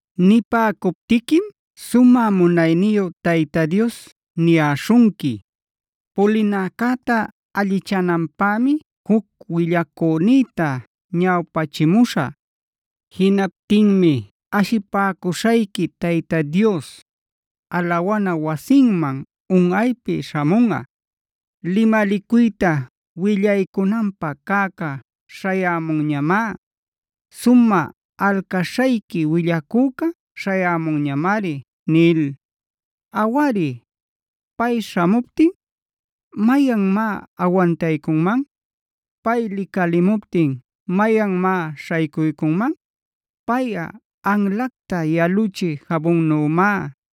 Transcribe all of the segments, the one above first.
Nipäcuptiquim sumä munayniyu Tayta Dios niyäśhunqui: “Pulinäcäta allichananpämia juc willacünïta ñawpachimuśhä. Jinaptinmi ashipäcuśhayqui Tayta Dios, alawana wasinman unꞌaypi śhamunꞌa. Limalicuyta willaycunanpä cäcä śhayämunñamá; sumä alcaśhayqui willacüca śhayämunñamari” nil. Awari, pay śhamuptin ¿mayanmá awantaycunman? Pay licalimuptin ¿mayanmá śhaycuycunman?b Payꞌa anlacta yaluchï jabunnümá;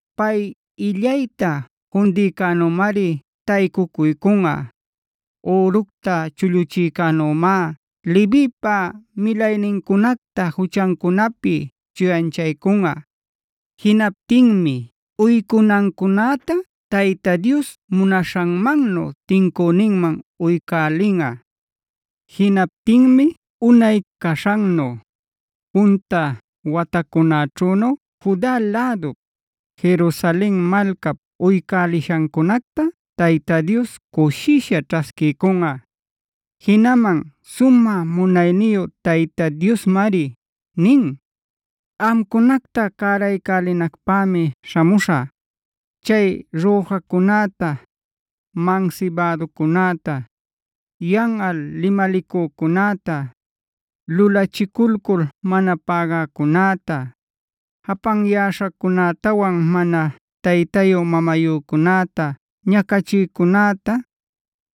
Pay illayta fundïcänümari taycuycunꞌa, üructa chulluchïcänümád Levipa milaynincunacta juchancunapi chuyanchaycunꞌa. Jinaptinmi uycunancunäta Tayta Dios munaśhanmannu tincüninman uycälinꞌa. Jinaptinmi unay caśhannu, punta watacunäćhünu Juda lädup, Jerusalen malcap uycälishancunacta Tayta Dios cushisha ćhasquiycunꞌa. Jinaman sumä munayniyu Tayta Diosmari nin: “Amcunacta cäraycälinacpämi śhamuśhä. Chay rüjacunäta, mansibäducunäta, yanꞌal limalicücunäta, lulachiculcul mana pägäcunäta, japanyäśhacunätawan mana taytayu-mamayücunäta ñacachïcunäta,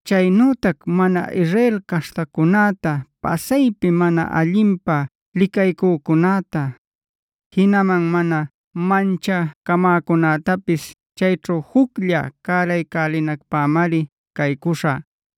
chaynütac mana Israel caśhtacunäta pasaypi mana allinpä licaycücunäta, jinaman mana manchacamäcunätapis chayćhu juclla cäraycälinacpämari caycuśhä.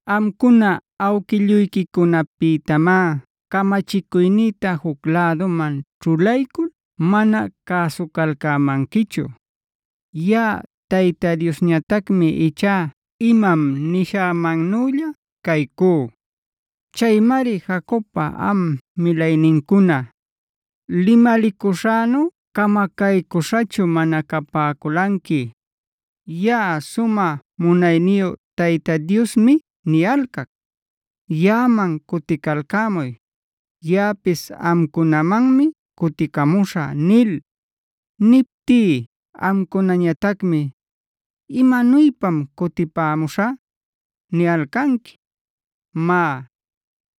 “Amcuna awquilluyquicunapïtamá camachicuynïta juc läduman ćhulaycul mana cäsucalcämanquichu. Yaꞌa Tayta Diosñatacmi ichá imam nishämannülla caycú.e Chaymari Jacobpa am milaynincuna, limalicuśhänuf camacaycüśhachu mana capäculanqui. Yaꞌa sumä munayniyu Tayta Diosmi niyalcac: ‘Yaꞌaman cuticalcämuy; yaꞌapis amcunamanmi cuticamuśhä’g nil. Niptí amcunañatacmi: ‘¿Imanuypam cutipämuśhä?’ niyalcanqui. Má,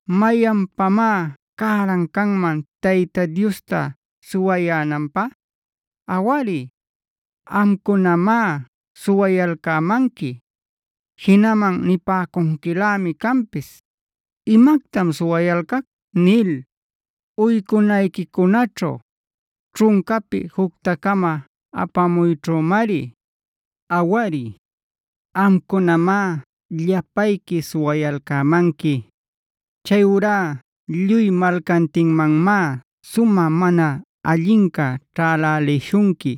¿mayanpamá cäran canman Tayta Diosta suwayänanpä? Awari, amcunamá suwayalcämanqui. Jinaman nipäcunquilämi canpis: ‘Imactam suwayalcac’ nil. Uycunayquicunaćhu, ćhuncapi jucta-cama apamuyćhümari. Awari, amcunamá llapayqui suwayalcämanqui. Chayurá lluy malcantinmanmá sumä mana allinca ćhälälishunqui.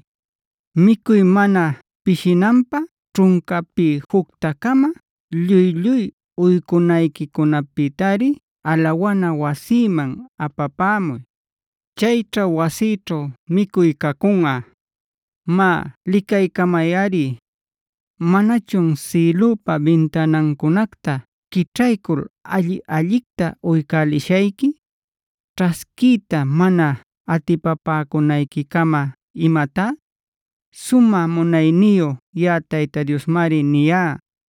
Micuy mana pishinanpä ćhuncapi jucta-cama lluy-lluy uycunayquicunapïtari alawana wasïman apapämuy. Chayćha wasïćhu micuy cacunꞌa. Má licaycamayꞌari, ¿manachun sïlüpa bintanancunacta quićhaycul alli-allicta uycälishayqui, ćhasquiyta mana atipapäcunayquicama imatá?h Sumä munayniyu yaꞌa Tayta Diosmari niyá.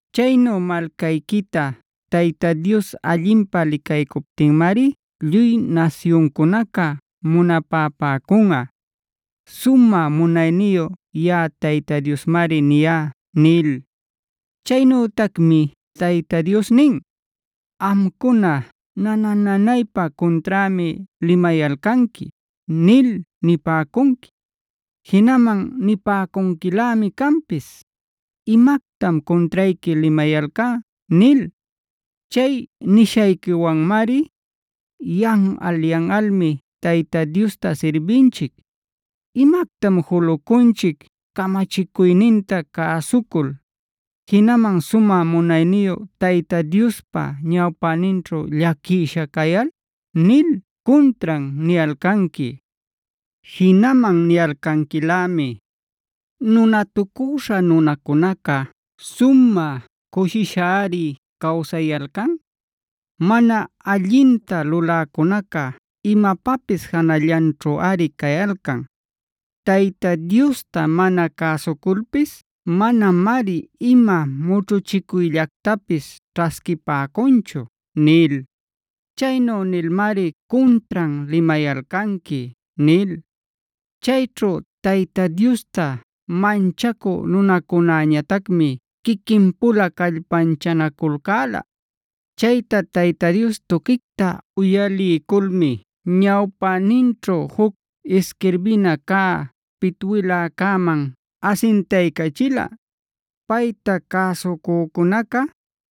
Chaynu malcayquita Tayta Dios allinpä licaycuptinmari lluy nasyuncunaca munapapäcunꞌa. Sumä munayniyu yaꞌa Tayta Diosmari niyá” nil. Chaynütacmi Tayta Dios nin: “Amcuna ‘nana-nanaypa cunträmi limayalcanqui’ nil nipäcunqui. Jinaman nipäcunquilämi canpis: ‘¿Imactam cuntrayqui limayalcá?’ nil. Chay nishayquiwanmari: ‘Yanꞌal-yanꞌalmi Tayta Diosta sirbinchic. ¿Imactam julucunchic camachicuyninta cäsucul, jinaman sumä munayniyu Tayta Diospa ñawpäninćhu llaquisha cayal?’ nil cuntran niyalcanqui. Jinaman niyalcanquilämi: ‘Nunatucüśha nunacunaca sumä cushishari cawsayalcan. Mana allinta luläcunaca imapapis janallanćhuꞌari cayalcan. Tayta Diosta mana cäsuculpis manamari ima mućhuchicuyllactapis ćhasquipäcunchu’ nil.i Chaynu nilmari cuntran limayalcanqui” nil. Chayćhu Tayta Diosta manchacü nunacunäñatacmi quiquin-pula callpanchanaculcäla. Chayta Tayta Dios tuquicta uyaliyculmi ñawpäninćhu juc isquirbina cä pitwiläcäman asintaycachila, payta cäsucücunaca,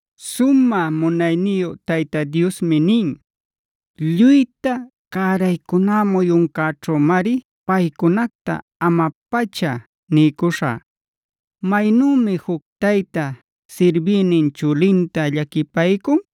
Sumä munayniyu Tayta Diosmi nin: “Lluyta cäraycuná muyuncäćhümari paycunacta ama-pacha niycuśhä. Maynümi juc tayta sirbïnin chulinta llaquipaycun,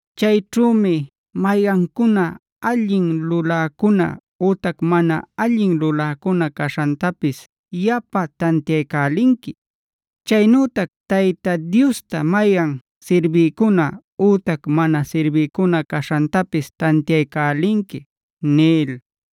Chayćhümi mayancuna allin luläcuna ütac mana allin luläcuna caśhantapis yapa tantiaycälinqui. Chaynütac Tayta Diosta mayan sirbïcuna ütac mana sirbïcuna caśhantapis tantiaycälinqui” nil.